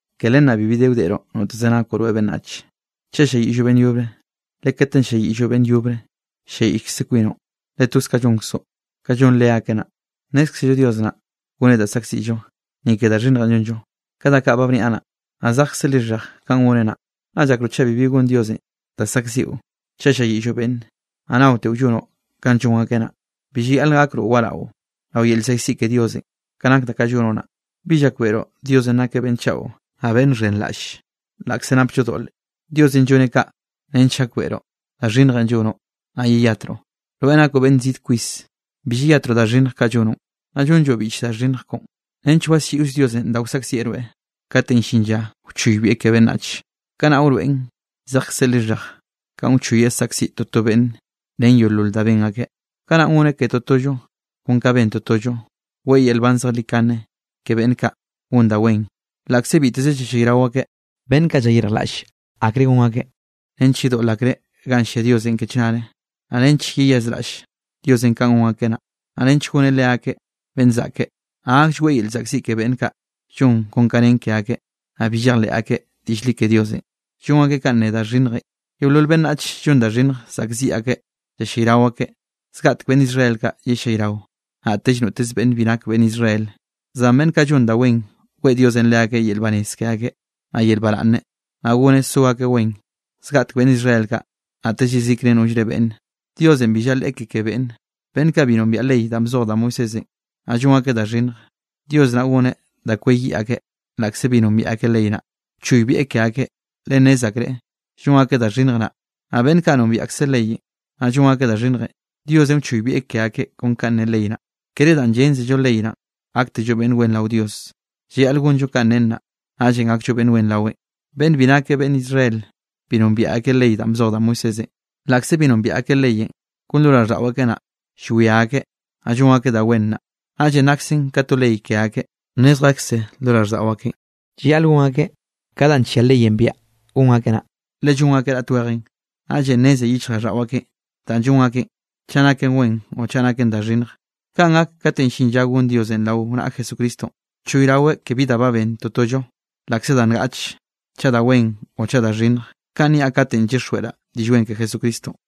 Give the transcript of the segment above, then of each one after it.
Ke len naꞌ bibi de wdeꞌroꞌ noteze nakoꞌ rweꞌ beꞌnnach, chaꞌ ll-lliayiꞌlloꞌ beꞌnn yobre, le katenꞌ ll-lliayiꞌlloꞌ beꞌnn yobre, ll-lliayiꞌllkze kwinoꞌ, le toz ka llonkzoꞌ, ka llon leakeꞌ naꞌ. Nnézkzello Dios naꞌ, goneꞌ da saꞌkziꞌllo, ni ke da xhinnjenꞌ llonllo, ka da kaꞌ ba bniaꞌ naꞌ, naꞌ zejkze lixhej kanꞌ goneꞌ naꞌ. ¿Naꞌ llakroꞌ chaꞌ bibi gonn Diosenꞌ da saꞌkziꞌo chaꞌ ll-lliayiꞌlloꞌ beꞌnne, naꞌ naoteꞌo llonoꞌ kanꞌ llon akeꞌn naꞌ? Bi llayaꞌl gakroꞌ waraꞌo rao yel llzaꞌkziꞌ ke Diosenꞌ, ka nak da kaꞌ llonoꞌ naꞌ. ¿Bi llakbeꞌroꞌ Diosenꞌ nakeꞌ beꞌnn chaꞌo, naꞌ beꞌnn xhenraꞌlle laꞌkze napllo doꞌle? Diosenꞌ lloneꞌ kaꞌ nench gakbeꞌroꞌ da xhinnjenꞌ llonoꞌ, naꞌ yeyatroꞌ. Rweꞌ nakoꞌ beꞌnn zid kwis, bi llayatroꞌ da xhinnj kaꞌ llonoꞌn, naꞌ llonlloꞌ biꞌch da xhinnj koꞌon nench waslliꞌoll Diosenꞌ da wsaꞌkzieꞌ rweꞌ kate llin lla wchoybieꞌ ke beꞌnnach. Kanaꞌ wroeꞌn zejkzeꞌ lixhej kanꞌ wchoyeꞌ saꞌkziꞌ toto beꞌnn ren yeolol da ben akeꞌ. Kanaꞌn goneꞌ ke totollo kon ka ben totollo. Weꞌe yel nban zejlikane ke beꞌnn kaꞌ gon da wen laꞌkze biteze yellayrao akeꞌ, beꞌnn kaꞌ llayirjlaꞌlle akre gon akeꞌ nench yedoꞌl akreꞌ ganꞌ llia Dios ke chnare, naꞌ nench yeyazraꞌll Diosenꞌ kanꞌ gon akeꞌ naꞌ, naꞌ nench goneꞌ leakeꞌ beꞌnn zaꞌke. Naꞌ gaklleꞌe weꞌe yel llzaꞌkziꞌ ke beꞌnn kaꞌ llon kon da nen ke akeꞌ, naꞌ bi llejleꞌ akeꞌ diꞌll li ke Diosenꞌ, llon akeꞌ kanꞌ ne da xhinnjenꞌ. Yeolol beꞌnnach llon da xhinnj saꞌkziꞌ akeꞌ yellayrao akeꞌ, zgaꞌtek beꞌnn Israel kaꞌ yellayrao, naꞌtellre noteze beꞌnn bi nak beꞌnn Israel. Zan beꞌnn kaꞌ llon da wen, weꞌe Diosenꞌ leakeꞌ yel banez ke akeꞌ, naꞌ yel baraꞌnne, naꞌ goneꞌ so akeꞌ wen. Zgaꞌtek beꞌnn Israel kaꞌ, naꞌtell yezikre nollre beꞌnne. Diosenꞌ bi llaleꞌe ke ke beꞌnne. Beꞌnn kaꞌ bi nombiaꞌ ley danꞌ bzoj da Moisésenꞌ, naꞌ llon akeꞌ da xhinnj, Dios naꞌ goneꞌ da kweyiꞌ akeꞌ laꞌkze bi nombiaꞌ akeꞌ ley naꞌ, wchoybieꞌ ke akeꞌ le nnez akreꞌ llon akeꞌ da xhinnj naꞌ. Naꞌ beꞌnn kaꞌ nombiaꞌ akseꞌ leyenꞌ, naꞌ llon akeꞌ da xhinnj, Diosenꞌ wchoybieꞌ ke akeꞌ kon ka ne ley naꞌ. Kere danꞌ yénzello ley naꞌ, gaktello beꞌnn wen rao Dios, llayaꞌl gonllo kanꞌ nen naꞌ, naꞌllenꞌ gakllo beꞌnn wen raweꞌn. Beꞌnn bi nake beꞌnn Israel, bi nombiaꞌ akeꞌ ley danꞌ bzoj da Moisésenꞌ. Laꞌkze bi nombiaꞌ akeꞌ leyenꞌ, kon lo raꞌlldaꞌo akeꞌ naꞌ, llwia akeꞌ, naꞌ llon akeꞌ da wen naꞌ, naꞌllenꞌ naksen ka to ley ke akeꞌ. Nnezjekze lo raꞌlldaꞌo akeꞌn llayaꞌl gon akeꞌ ka danꞌ nllia leyenꞌ biaꞌa gon akeꞌ naꞌ, le llon akeꞌ raꞌt wejenꞌ. Naꞌllenꞌ nneze yichjraꞌlldaꞌo akeꞌn danꞌ llon akeꞌn, chaꞌ naken wen o chaꞌ naken da xhinnj. Kanꞌ gak kate llin lla gon Diosenꞌ rao naꞌa Jesucristonꞌ, choyraweꞌ ke bi da ba ben totollo laꞌkze da ngaꞌche, chaꞌ da wen o chaꞌ da xhinnj. Kanꞌ niaꞌ katenꞌ llyixjweꞌraꞌ Diꞌll Wen ke Jesucristonꞌ.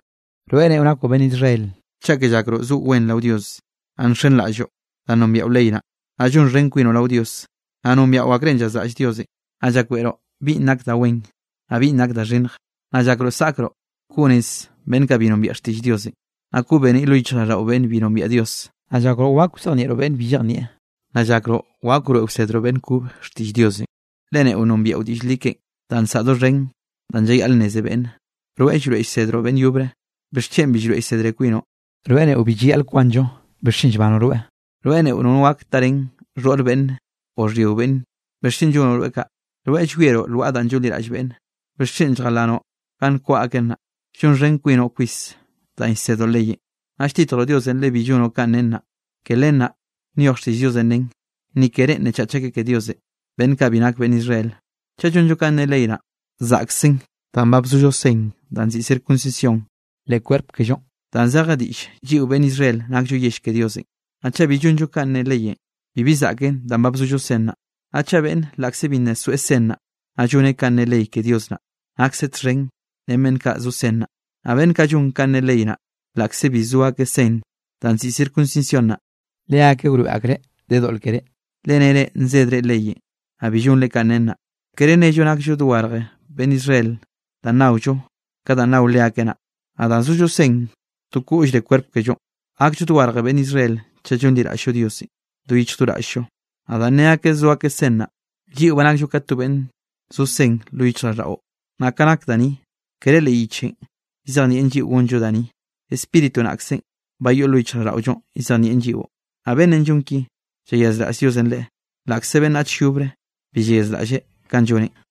Rweꞌ neꞌo nakoꞌ beꞌnn Israel, cheke llakroꞌ zoꞌo wen rao Dios, naꞌ nxenraꞌlloꞌ danꞌ nombiaꞌo ley naꞌ, naꞌ llonxhen kwinoꞌ rao Dios. Naꞌ nombiaꞌo akrenꞌ llazraꞌll Diosenꞌ, naꞌ llakbeꞌroꞌ binꞌ nak da wen, naꞌ binꞌ nak da xhinnj. Naꞌ llakroꞌ zaꞌkroꞌ koꞌ nez beꞌnn kaꞌ bi nombiaꞌ xtiꞌll Diosenꞌ, naꞌ koꞌ beniꞌ lo yichjraꞌlldaꞌo beꞌnn bi nombiaꞌ Dios. Naꞌ llakroꞌ wak wzejnieꞌroꞌ beꞌnn bi llejnieꞌ, naꞌ llakroꞌ wak wroeꞌ wsedroꞌ beꞌnn kobe xtiꞌll Diosenꞌ, le neꞌo nombiaꞌo diꞌll li keꞌen, danꞌ nsaꞌa doxhen danꞌ llayaꞌl nneze beꞌnne. Rweꞌ llroeꞌ llsedroꞌ beꞌnn yobre, ¿bixchen bi llroeꞌ llsedre kwinoꞌ? Rweꞌ neꞌo bi llayaꞌl kwanllo, ¿bixchen llbanoꞌ rweꞌ? Rweꞌ neꞌo nono gak tarén xhoꞌr beꞌnne o xhyio beꞌnne, ¿bixchen llonoꞌ rweꞌ kaꞌ? Rweꞌ llwieroꞌ lwaꞌa da llonliraꞌll beꞌnne, ¿bixchen lljalanoꞌ ganꞌ nkwaꞌa aken naꞌ? Llonxhen kwinoꞌ kwis danꞌ llsedoꞌ leyenꞌ, naꞌ lltitjroꞌ Diosenꞌ le bi llonoꞌ kanꞌ nen naꞌ. Ke len naꞌ nyoj xtiꞌll Diosenꞌ nen: “Ni ke reꞌn nnechach akeꞌ ke Diosenꞌ, beꞌnn kaꞌ bi nak beꞌnn Israel.” Chaꞌ llonllo kanꞌ ne ley naꞌ, zaꞌksen danꞌ ba bzollo sen danꞌ nziꞌi circuncisión leꞌ kwerp kellonꞌ, danꞌ zeje diꞌll, lliꞌo beꞌnn Israel nakllo yell ke Diosenꞌ. Naꞌ chaꞌ bi llonllo kanꞌ ne leyenꞌ, bibi zaꞌken danꞌ ba bzollo sen naꞌ. Naꞌ chaꞌ beꞌnn laꞌkze bi nna soeꞌ sen naꞌ, naꞌ lloneꞌ kanꞌ ne ley ke Dios naꞌ, nakseꞌ txhen ren beꞌnn kaꞌ zo sen naꞌ. Naꞌ beꞌnn kaꞌ llon kanꞌ ne ley naꞌ, laꞌkze bi zo akeꞌ sen danꞌ nziꞌi circuncisión naꞌ, leakeꞌ wroeꞌ akreꞌ de doꞌl keré, le nere nzedre leyenꞌ, naꞌ bi llonre kanꞌ nen naꞌ. Kere nello nakllo dogarj beꞌnn Israel danꞌ naollo ka danꞌ nao leakeꞌ naꞌ, naꞌ danꞌ zollo sen to koꞌllre kwerp kellonꞌ. Gakllo dogarje beꞌnn Israel chaꞌ llonliraꞌll-llo Diosenꞌ do yichj do raꞌll-llo. Naꞌ danꞌ ne akeꞌ zo akeꞌ sen naꞌ, lliꞌo ba nakllo ka to beꞌnn zo sen lo yichjraꞌlldaꞌo. Naꞌ ka nak da ni, kere leꞌ yichenꞌ llzejnieꞌn lliꞌo gonllo da ni, Spíritu naꞌkzenꞌ ba yoꞌn lo yichjraꞌlldaꞌollo llzejnieꞌn lliꞌo. Naꞌ beꞌnnenꞌ llon ki, llayazraꞌll Diosenꞌ leꞌe, laꞌkze beꞌnnach yobre bi llayazraꞌlleꞌ kanꞌ lloneꞌ.